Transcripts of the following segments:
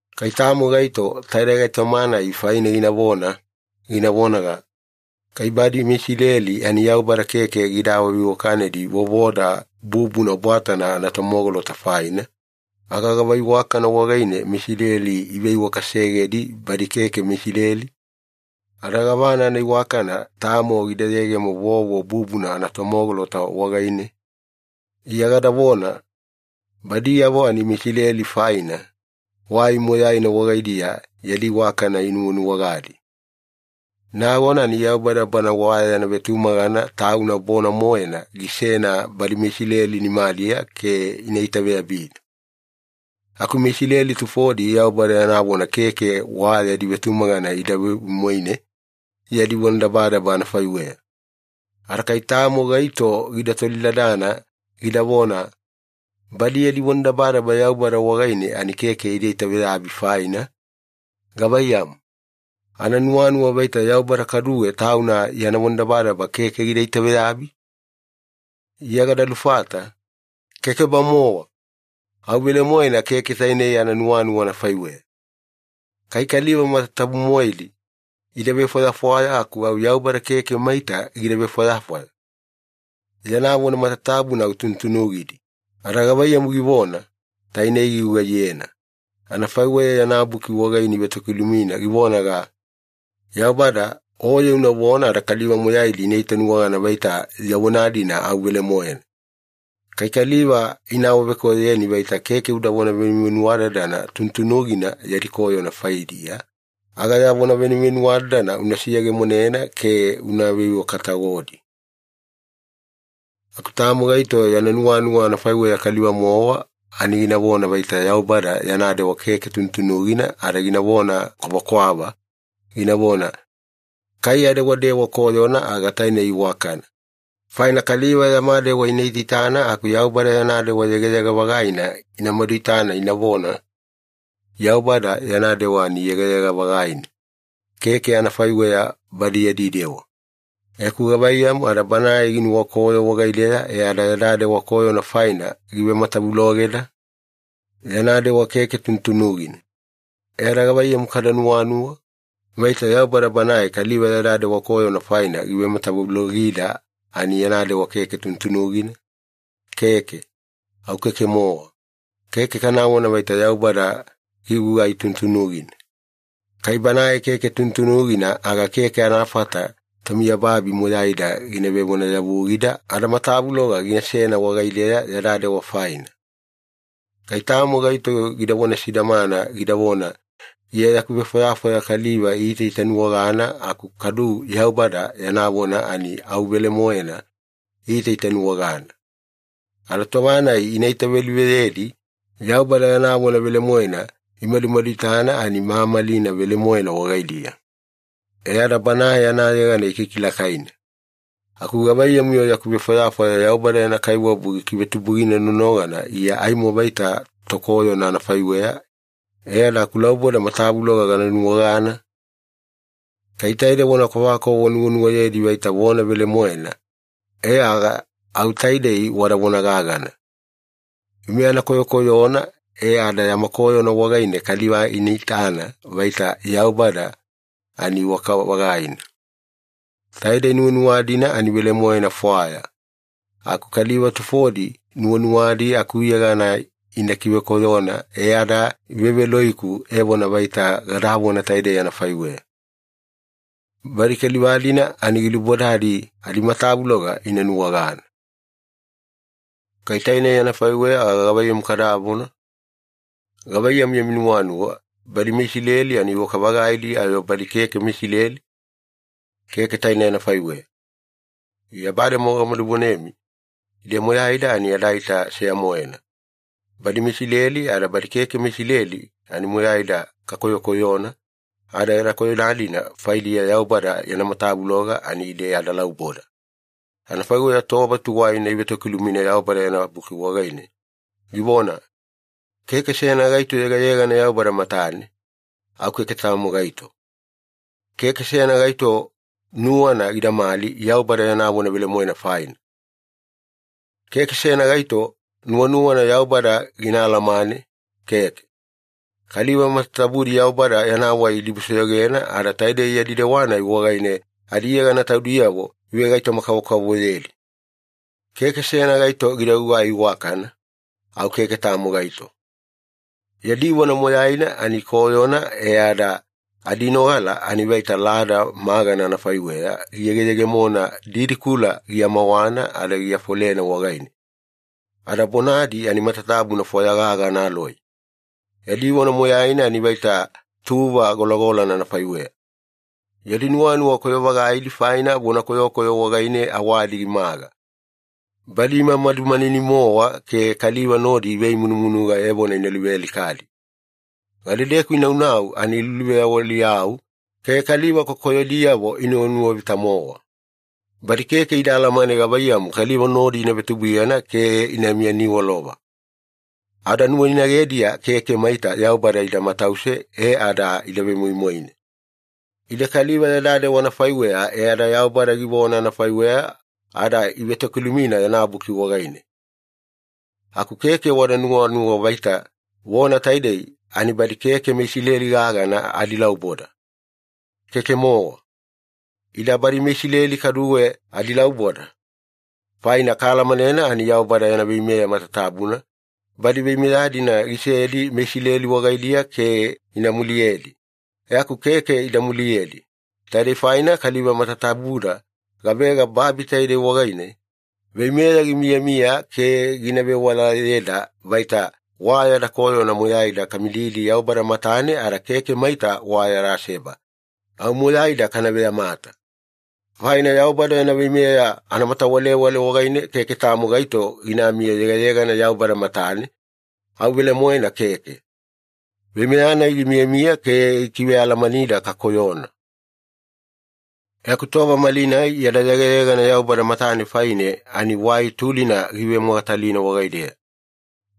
Kai tamo gaito taide gaitoma-nai faine ginavona, gina vonaga, “Kai badi meIsileli ani Yaubada keke gida awaveiwakanedi vovoda bubuna bwatana anatomogolota faina, aga gava iwakana wagaine meIsileli iveiwakasegedi badi keke meIsileli? Ada gavana anaiwakana tamo gida yegemo vovo bubuna anatomogolota wagaine?” Iya gadavona, “Badiyavo ani meIsileli faina, wai moyaina wagaidiya yadi iwakana inuwanuwagadi. Nagona ani Yaubada Bana wa yana vetumagana Tauna bona-moena gisena badi meIsileli nimadiya ke ina itaveyabina.” Aku MeIsileli tufodi Yaubada yana vona keke wa yadi vetumagana ida vemoimoine yadi vonadabadaba anafaiweya. Ada kai tamo gaito gida tolidadana, gidavona, “Badi yadi vonadabadaba Yaubada wagaine ani keke ida itaveyabi faina, gavaiyamu? Ananuwanuwa vaita Yaubada kaduwe Tauna yana vonadabadaba keke gina itaveyabi?” Iya gada lufata, “Keke-bamowa! Au velemoena keke tainei ananuwanuwa anafaiweya. Kai kaliva matatabu-moedi ida vefwayafwaya aku au Yaubada keke maita gida vefwayafwaya. Yana vona matatabuna au tunutunugidi, ada gavaiyamu givona, tainei gigugaiyena. Anafaiweya yana Buki wagaine ivetokilumina givonaga, ‘Yaubada, Oye unavona ada kaliva moyaidi ina itanuwagana vaita ya vona-dina au velemoena. Kai kaliva ina awavekoyoyeni vaita keke udavona venuvenuwadadana tunutunugina yadi koyona faidiya, aga ya vona venuvenuwadadana una seyegemonena ke una veiwaka-tagodi.’” Aku tamo gaito yana nuwanuwa anafaiweya kaliva-mowa ani ginavona vaita Yaubada yana dewa keke tunutunugina ada ginavona kwavakwava, ginavona, “Kai adewadewa koyona aga tainei iwakana, faina kaliva yama dewa ina itaitana aku Yaubada yana dewa yegayega-vagaina ina maduitana inavona, ‘Yaubada yana dewa ani yegayega-vagaina, keke anafaiweya badi yadi dewa.’ E aku gavaiyamu ada Banae ginuwakoyo wagaideya ada yada dewa koyona faina givematavulogeda? Yana dewa keke tunutunugina. E ada gavaiyamu kada nuwanuwa? Vaita Yaubada Banae kaliva yada dewa koyona faina givematavulogida ani yana dewa keke tunutunugina?” Keke! Au keke-mowa. Keke kanavona vaita Yaubada gigugai tunutunugina. Kai Banae keke tunutunugina, aga keke anafata tomiyababi moyaida gina vevonayavugida ada matavuloga ginasena wagaideya yada dewa faina. Kai tamo gaito gidavona sidamana, gidavona, “Iya yaku vefwayafwaya kaliva iitaitanuwagana aku kadu Yaubada yana vona ani au velemoena iitaitanuwagana. Ada tova-nai ina itaveluveyedi, Yaubada yana vona velemoena imadumaduitana ani mamalina velemoena wagaidiya. E ada Banae anayegana ikikilakaina. Aku gavaiyamu-yo yaku vefwayafwaya Yaubada yana kaiwabu gikivetubugina nonogana Iya aimo vaita tokoyona anafaiweya e ada akulauboda matavuloga gana nuwagana?” Kai taide vona kwavakwava wanuwanuwayedi vaita vona velemoena, e aga au taidei wada vona gagana, “Ime ana koyokoyona e ada yama koyona wagaine kaliva ina itana vaita Yaubada ani iwaka-vagaina.” Taidei nuwanuwa-dina ani velemoena fwaya, aku kaliva tufodi nuwanuwadi akuyegana ina kivekoyona e ada iveveloiku evona vaita gadavona taidei anafaiweya. Badi kaliva-dina ani gilubodadi adimatavuloga ina nuwagana. Kai tainei anafaiweya aga gavaiyamu kadavona? Gavaiyamu yami nuwanuwa, badi meIsileli ani iwaka-vagaidi ayo badi keke meIsileli? Keke tainei anafaiweya. Iya bademowa gamadu vonemi ide moyaida ani adaita seya-moena. Badi meIsileli ada badi keke meIsileli ani moyaida kakoyokoyona, ada yada koyona-dina faidiya Yaubada yana matavuloga ani ide adalauboda. Anafaiweya tova tuwaina ivetokilumina Yaubada yana Buki wagaine, givona, “Keke seyana gaito yegayegana Yaubada matane, au keke tamo gaito. Keke seyana gaito nuwana gidamali Yaubada yana vona velemoena faina. Keke seyana gaito nuwanuwana Yaubada gina alamane, keke. Kaliva matatabudi Yaubada yana wai idibusoyogena, ada taidei yadi dewa-nai wagaine adiyegana taudiyavo ivegaitoma-kavokavovoyedi. Keke seyana gaito gida gugai iwakana, au keke tamo gaito. Yadi vona moyaina ani koyona e ada adinogala ani vaita lada magana anafaiweya giyegeyegemona didikula giamawana ada giafolena wagaine, ada bonadi ani matatabuna fwaya gaga analoi. Yadi vona moyaina ani vaita tuva golagolana anafaiweya. Yadi nuwanuwa koyo-vagaidi faina, vona koyokoyo wagaine awadi gimaga. Badi imamadu manini-mowa ke kaliva nodi ivemunumunuga evona ina luvealikadi. Gadedeku inaunau ani iluluveyawaliyau ke kaliva kokoyodiyavo inuwanuwavita-mowa. Badi keke ida alamane gavaiyamu kaliva nodi ina vetubuiyana ke ina miyaniwalova. Ada nuwainagediya keke maita Yaubada ida matause e ada ida vemoimoine.” Ide kaliva yada dewa anafaiweya e ada Yaubada givona anafaiweya ada ivetokilumina yana Buki wagaine. Aku keke wada nuwanuwa vaita vona taidei ani badi keke meIsileli gagana adilauboda. Keke-mowa. Ida badi meIsileli kaduwe adilauboda. Faina kaalamanena ani Yaubada yana veimeya matatabuna, badi veimeya-dina gisedi meIsileli wagaidiya ke ina muliyedi. E aku keke ida muliyedi. Taidei faine kaliva matatabuda gavega babi taide wagaine, veimeya gimiyamiya ke gina vewalayeda vaita wa yada koyona moyaida kana mididi Yaubada matane ada keke maita wa yada seba, au moyaida kana veyamata. Faina Yaubada yana veimeya anamatawalewale wagaine keke tamo gaito ginami yegayegana Yaubada matane, au velemoena keke. Veimeya-nai gimiyamiya ke gikivealamanida kakoyona. E aku tova malinai yada yegayegana Yaubada matane faine ani wai tulina givemogatalina wagaideya,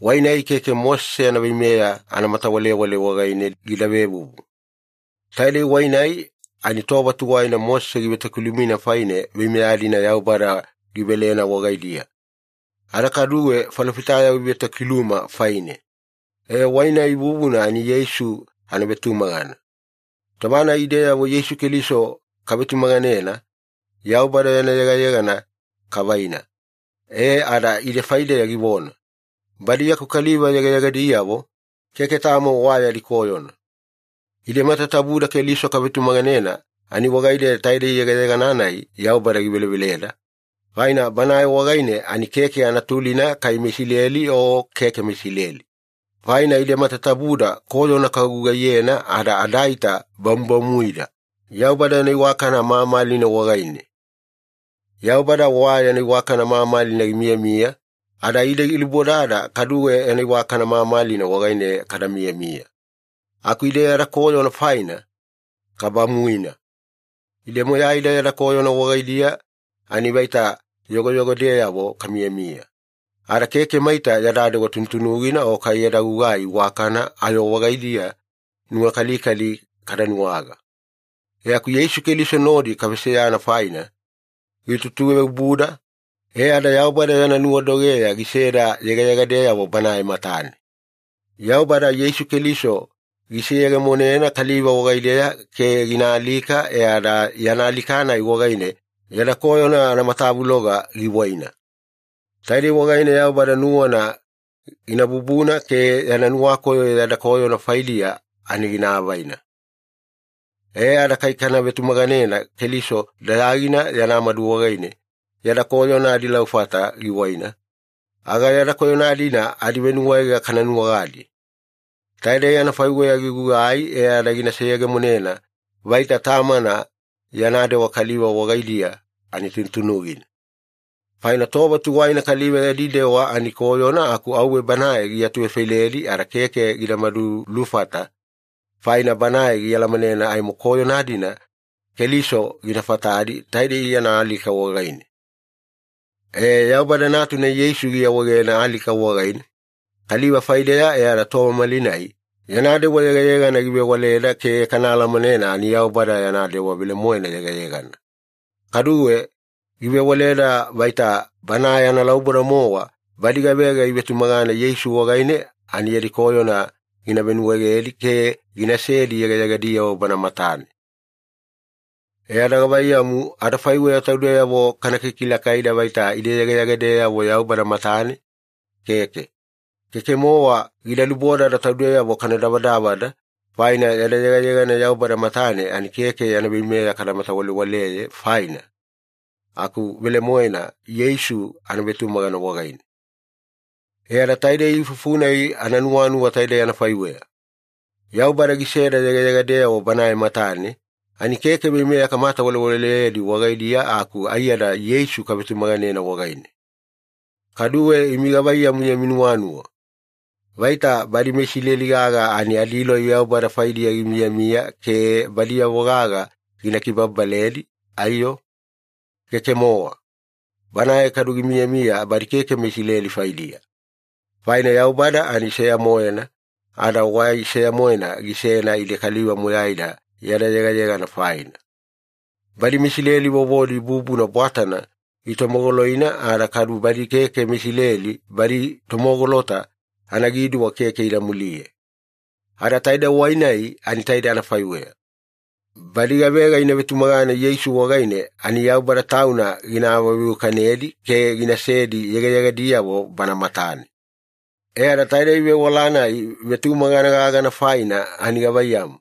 wai-nai keke Mosese yana veimeya anamatawalewale wagaine gida vevuvu. Taidei wai-nai ani tova tuwaina Mosese givetokiluma faine veimeya-dina Yaubada givelena wagaidiya, ada kaduwe falofitayavo ivetokiluma faine. E, wai-nai vuvuna ani Yeisu anavetumagana. Tova-nai ideyavo Yeisu Keliso kavetumaganena, Yaubada yana yegayegana kavaina, e ada ide faideya givona, “Badi yaku kaliva yegayegadiyavo, keke tamo wa yadi koyona.” Ide matatabuda Keliso kavetumaganena ani wagaideya taidei yegayegana-nai Yaubada giveleveleda, faina Banae wagaine ani keke anatulina kai meIsileli o keke meIsileli. Faina ide matatabuda koyona kagugaiyena ada adaita bamubamuida Yaubada yana iwakana mamalina wagaine. Yaubada wa yana iwakana mamalina gimiyamiya, ada ide gilubodada kaduwe yana iwakana mamalina wagaine kada miyamiya, aku ide yada koyona faina, kabamuina. Ide moyaida yada koyona wagaidiya ani vaita yogoyogodeyavo kamiyamiya, ada keke maita yada dewa tunutunugina o kai yada gugai iwakana ayo wagaidiya nuwakalikali kada nuwaga. E aku Yeisu Keliso nodi kaveseyana faina, gitutuveobuda, e ada Yaubada yana nuwadogeya giseda yegayegadeyavo Banae matane. Yaubada Yeisu Keliso giseyegemonena kaliva wagaideya ke gina alika e ada yana alika-nai wagaine yada koyona anamatavuloga giwaina. Taidei wagaine Yaubada nuwana gina bubuna ke yana nuwakoyo yada koyona faidiya ani gina avaina. E ada kai kana vetumaganena Keliso dayagina yana madu wagaine yada koyona adilaufata giwaina, aga yada koyona-dina adivenuwaega kana nuwagadi. Taidei anafaiweya gigugai e ada gina seyegemonena vaita Tamana yana dewa kaliva wagaidiya ani tunutunugina. Faina tova tuwaina kaliva yadi dewa ani koyona aku auwe Banae giatuvefailedi ada keke gida madulufata, faina Banae gialamanena aimo koyona-dina Keliso gina fatadi taidei yana alika wagaine. E, Yaubada Natuna Yeisu giawaegena alika wagaine kaliva faideya e ada tova malinai yana dewa yegayegana givewaleda ke kana alamanena ani Yaubada yana dewa velemoena yegayegana. Kaduwe, givewaleda vaita Banae analauboda-mowa badi gavega ivetumagana Yeisu wagaine ani yadi koyona gina venuwaegedi ke ginasedi yegayegadiyavo Bana matane. E ada gavaiyamu, adafaiweya taudeyavo kana kilakaida vaita ide yegayegadeyavo Yaubada matane? Keke. Keke-mowa gida lubodada taudeyavo kana davadavada, faina yada yegayegana Yaubada matane ani keke yana veimeya kamatawalewaleyena faina aku velemoena Yeisu anavetumagana wagaine. E ada taidei ifufu-nai ananuwanuwa taidei anafaiweya. Yaubada giseda yegayegadeyavo Banae matane, ani keke veimeya kamatawalewaleyedi wagaine aku aiyada Yeisu kavetumaganena wagaine. Kaduwe imi gavaiyamu yami nuwanuwa? Vaita badi meIsileli gaga ani adiloi Yaubada faidiya gimiyamiya ke badiyavo gaga gina kibababaledi, aiyo? Keke-mowa. Banae kaduwe gimiyamiya badi keke meIsileli faidiya. Faina Yaubada ani seya-moena, ada wai seya-moena gisena ide kaliva moyaida yada yegayegana faina, badi meIsileli vovodi bubuna bwatana itomogoloina ada kadu badi keke meIsileli badi tomogolota anagiduwa keke ida muliye. Ada taide wai-nai ani taidei anafaiweya. Badi gavega ina vetumagana Yeisu wagaine ani Yaubada Tauna gina awaveiwakanedi ke ginasedi yegayegadiyavo Bana matane. E ada taidei vewala-nai vetumagana gaga faina ani gavaiyamu,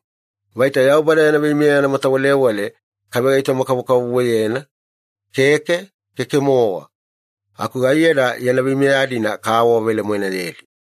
vaita Yaubada yana veimeya anamatawalewale kavegaitoma-kavokavovoyena? Keke, keke-mowa. Aku aiyada yana veimeya-dina kaawavelemoenayedi.